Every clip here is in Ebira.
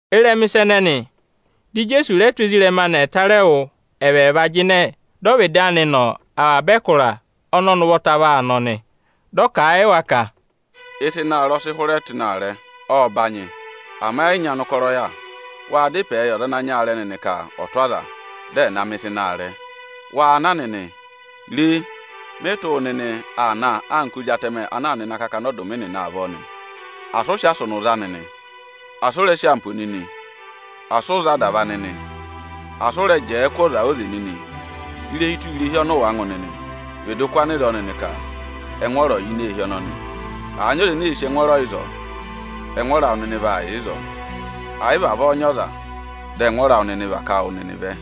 Ịrẹma ịsa ẹnẹnị, dị Ijeesu rẹ tụ́ ezirẹma anị ẹtarẹwụ ẹvẹẹva jịnẹ dọ ọvịdị anị nọ ịnị avaba ẹkụra ọnị ọnị ụvọta vaa nọ nị. Dị ọ kà a yị wa ka, “Ịsa ịnị aarẹ ọ sị hụrẹ tụ́ ịnị aarẹ, ộ rụrụ; ama ẹ yị nyị ọnụkọrọ yà. Waa dá ịpẹẹ yị ọza ana nyị aarẹ nịnị ka ọ̀ tụ́ aza, dị ẹ̀ na mẹ̀ ịsa ịnị aarẹ. Waa na nịnị! Re, mị tụ́ wụ nịnị aa na anka ozi atẹmẹ ana aa nọ ịnị akakana akatapooro nịnị avọọ nị. Asị ụ sị asụnụ za nịnị, asị ụ rẹ sị ampo nịnị! Asị ụ za adava nịnị, asị ụ rẹ jẹẹ kụ́ ọza óze nịnị. Irehi tụra irehi ọnị ụ wàa ngụ nịnị, vịdị kụ́ anịzọọ nịnị ka, ‘Ẹngwọọrọ ọ̀ yà ini eehi ọnọnị!’ Àa nyị ọza ene sì ịrẹyị ẹngwọọrọ ịzọọ, ẹngwọọrọ awụ nịnị vaa yà ịzọọ; ẹ̀ yị vavọọ nyị ọza, dị ẹngwọọrọ awụ nịnị ọ̀ và ká wụ nịnị vẹ.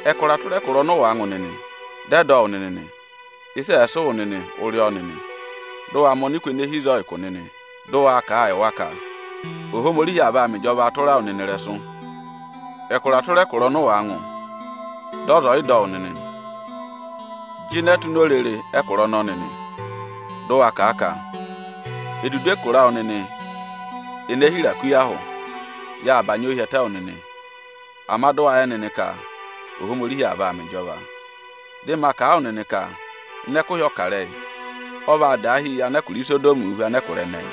Ẹkụra tụra ẹkụra ọnị ụ wàa ngụ nịnị, dị ẹ dọ wụ nịnị nị, ịsị ẹ̀ẹ sị wụ nịnị, ụ rị ọ nịnị; mẹ ọnịkụ ene èe hi ịzọọ ụkụ nịnị! dị ụ wa kà a yị wa ka: ‘Ohomorihi aa vaa mẹ ịjọva tụra wụ nịnị ịrẹsụ!’ Ẹkụra tụra ẹkụra ọnị ụ wàa ngụ, dị ọza ọ̀ yị dọ wụ nịnị nị, jịnẹ tụ́ ini orere ẹkụra ọnọọ nịnị, dị ụ wa kà a ka: ‘Edudu ẹkụra awụ nịnị ene hira kú yị ahụ, yâ bànyị ọọ hi ẹtẹ wụ nịnị. Ama dị ụ wa yẹ nịnị ka Ohomorihi aa vaa mẹ ịjọva nịnị o!’ Dị ma kà a wụ nịnị ka ịnị ẹkụhị ọkarẹyị, ọ vaa daahi yị anẹkụra Isodọmị hu anẹkụra ẹnẹẹ.”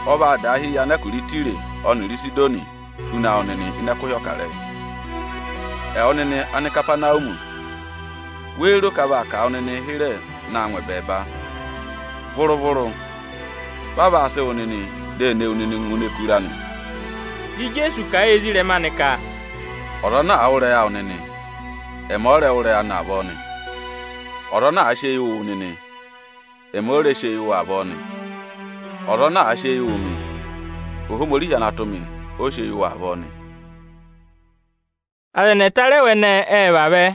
Ọ vaa daahi yị anẹkụra Ịtaya ọnịrị Ịsịdọnị huna wu nịnị ịnị ẹkụhị ọkarẹyị. Ẹwụ nịnị Anikapanawumi, wéé ro ka a vaa kà wụ nịnịị hịrẹ na ngụ ẹbẹẹba? Vụrụ-vụrụ! Va vaa sị wụ nịnị di e ne wu nịnị ngụ ini ẹkụra nị.” Dị Ijeesu kà a yị ezirẹma anị ka, “Ọza ana àa wụ́ ịrẹyị awụ nịnị, ẹmị ọ rẹ wụ́ ịrẹyị anị avọọ nị. Ọza ana àa sị eyi wụ wụ nịnị, ẹmị ọ rẹ sị eyi wụ avọọ nị. Ọza ana àa sị eyi wụ̀ mị, Ohomorihi ana tụ́ mị, ọ sị eyi wụ avọọ nị.” Aza ẹnị ẹtarẹwụ ẹnẹẹ ệ vavẹ.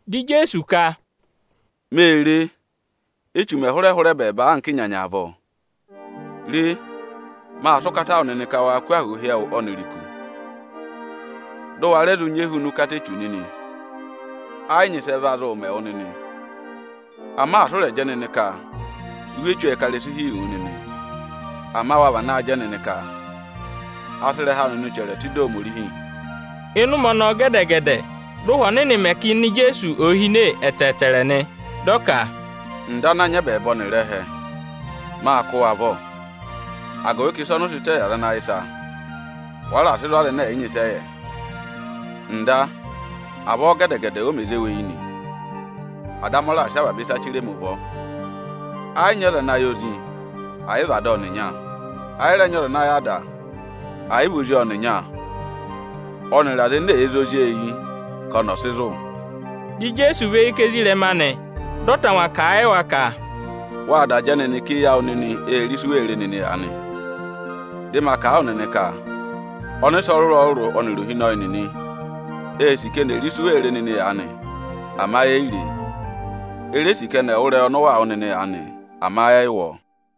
Dị Ijeesu ka, “Mê re, Échu mẹ̀ hụrẹ ẹbẹẹba anka ịnyanya avọọ. Re, mâ sị ụkata wụ nịnị ka waa kụ́ ahụụ hi ẹwụ ọnịrị iku, dị ụ wa rẹ zụ nyị ehuna ụkata Echu nịnị. Ẹ yị nyị ịsị ẹ va zụụ mẹ wụ nịnị. Ama asị ụ rẹ̀ jẹ nịnị ka ụhwẹ echu ệ ká ịrẹsụ hi wu nịnị! Ama wa vanaa jẹ nịnị ka a sị ịrẹha awụ nịnị chẹrẹ tụ́ ịdị Ohomorihi!” Ịnị ụmẹ ọnọọ gẹdẹ-gẹdẹ dị Ụhwẹ Ọnịnị mẹ ka ịnẹ Ijeesu ò hine ẹtẹẹtẹrẹ nị. Dị ọ ka, “Nda ana nyị ẹbẹẹba ọnịrị ẹhẹ, mâ kụ́ wụ avọ, agụvị ka ịsa ọnị ụ sị tẹ yị aza ana yẹ ịsa, wa raà sị zụ̀ aza ẹnẹ ẹ̀ yị nyị ịsị ẹ yẹ. Nda, avọọ gẹdẹ-gẹdẹ o mè zé wu eyi nị. Ada amị ọ raà sị avaba ịsa chire mi ụvọ. Ẹ yị nyị ọza ana yẹ Ozi, ẹ̀ yị vị Ada ọnịnya. Ẹ yị rẹ nyị ọza ana yẹ Ada, ẹ̀ yị vị Ozi ọnịnya ọnịrị aza ene èe zé Ozi eyi ka ọnị ọ̀ sị zụ̀.” Dị Ijeesu và eyi kà ezirẹma anị, dị ọ tangwa kà a yị wa ka, “Wâ da jẹ nịnị ka eyi awụ nịnị ee re ịsị u wee re nịnị aanị. Dị ma kà a wụ nịnị ka ọnịsẹ ọrụrụ-ọrụrụ ọnịrị ohinọyị nịnị ê sì ka eni è re ịsị u wee re nịnị aanị; ama eyi re e. E re sì ka ẹnị ẹ̀ wụ́ ịrẹyị ọnị ụ waa wụ́ nịnị aanị; ama ẹ yị wụ́ ọọ.”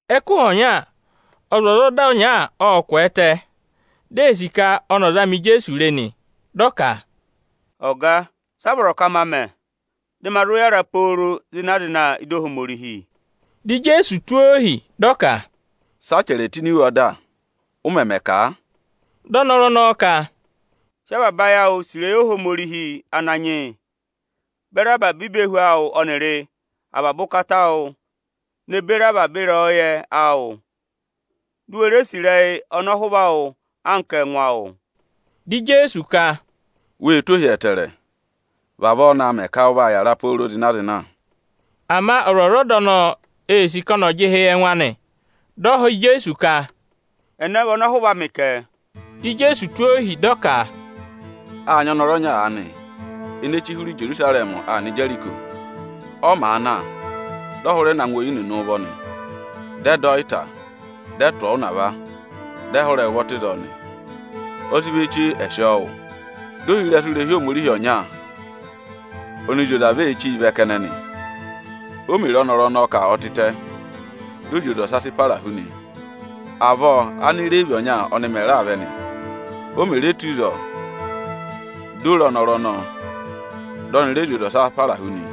Ẹkụhị ọnya, ọzwọzọda ọnya ộ kwẹẹtẹ, di ee sì ka ọnị ọ̀ zama Ijeesu re nị. Dị ọ ka, “Ọga, si a vọrọ ka ma mẹ, dị ma zụ yàra pooro zịna-zịna ị́dị Ohomorihi?” Dị Ijeesu tụ́ ọ ohi, dị ọ ka, “Sị a chẹrẹ tụ́ ini iwe ọda? Ụ mẹmẹ kà a?” Dị ọnọrụ ọnọọ ka, “Sị avaba ayị awụ sì ịrẹyị Ohomorihi Ananyị yị, beri avaba ivehu awụ ọnịrị avaba ụkata awụ ne beri avaba ịrẹyọyẹ awụ! Di u we re sì ịrẹyị ọnọhụva awụ anka ẹngụ awụ!” Dị Ijeesu ka, “Wê tụ́ ohi ẹtẹẹrẹ. Vavọọ naa mẹ ka ụ vaa yàra pooro zịna-zịna.” Ama ọzwọzọda ọnọọ ee sì ka ọnị ọ̀ jị ịhị yị ẹngụ anị; dị ọ họ̀ Ijeesu ka, “Ẹnẹ vị ọnọhụva amị kẹ?” Dị Ijeesu tụ́ ohi, dị ọ ka, “Â nyị ọnọrụ ọnya aanị, ene chí hụrẹ Ijerusarẹmị aa nọ Ijeriko. Ọ màa na, dị ọ hụrẹ na ngụ oyi nịnị ụvọ nị. Dị ẹ dọ ọ ịta, dị ẹ tụ̀ ọọ ụnava, dị ẹ hụrẹ ẹ ụvọ tụ́ ịzọọ nị. Ọ sị vọ chee, ẹ̀ sị ọọ wụ. Dị ohirẹsụ irehi Ohomorihi ọnya ọnị zị oze avọọ ee chíi vẹ kẹnẹ nị. O mè re ọnọrụ ọnọọ ka ọ tịtẹ, dị ọ zị oze ọsa para hu nị. Avọọ Ánireevi ọnya ọnị mẹ̀ raa vẹ nị. O mè re tù ịzọọ, di o re ọnọrụ ọnọọ, dị ọnị rẹ zị oze ọsa para hu nị.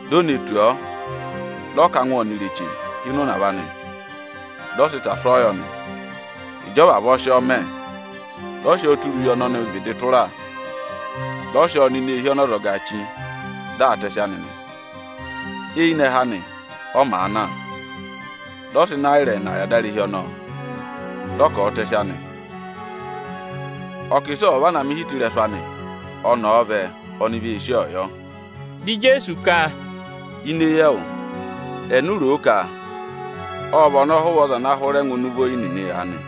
Di o ne tù ọọ, dị ọ ká angwẹ ọnịrị eche hi ịnị ụnava anị, dị ọ sị ịta sụ́ ọọ yọ nị. Ịjị ọ vavọọ sị ọọ mẹ, dị ọ sị ọọ tụra uye ọnị ọnị vịdị tụra, dị ọ sị ọọ nọ ini eehi ọnị ọzọgaā chí, di aa tẹsị anị nị. Eyinẹhẹ anị, ọ màa na, dị ọ sị Ịnayịra ẹẹna yị adarehi ọnọọ, dị ọ ka ọ̀ọ tẹsị anị. Ọ kà ịsị ọ̀ọ vana mẹ ịhị tụ́ ịrẹsụ anị, ọnị ọ̀ọ vẹ, oni vee sí ọọ yọ.” Dị Ijeesu ka, “Ini eyi ẹwụ, eni u ro ka ộ vị ọnọhụva ọza ana hụrẹ ngụ ịnị ụvọ oyi nịnị aanị?”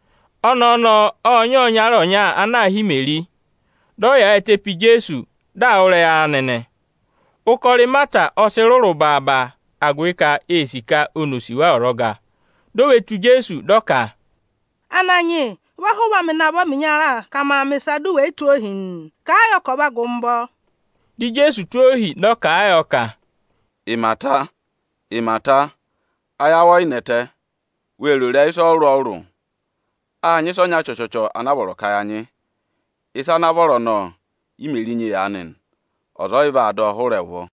Ọnẹẹ ọnọọ ộ nyị ọyịnyara ọnya ana aā hị́ Imeri; dị ọ yaayịtẹ pe Ijeesu, di aa wụ́ ịrẹyị anị nị. Ụkọrọ Ịmata ọ sị rụrụ baaba, agụvị ka ee sì ka oni ò sì wa ọzọga. Di o ve tù Ijeesu, dị ọ ka, “Ananyị yị, vị ọhụva amị navọ ẹmị ịnya ka maa mẹ̀ ịsa, du wè yi tụ́ ohi nịị? Kàa yọ ka ọ̀ va gụ mị ụvọ!” Dị Ijeesu tụ́ ohi, dị ọ kà a yọ ka, “Ịmata, Ịmata, ayị awụ ọ yị nẹtẹ, wee ro ịrẹyị ịsa ọrụrụ-ọrụrụ. Â nyị ịsa ọnya chọchọchọ anaa vọrọ ka ya nyị; ịsa ana vọrọ ọnọọ, Ímeri nyị aanị nị. Ọza ọ yị vaa dọ ọ hụrẹ ẹ ụvọ.”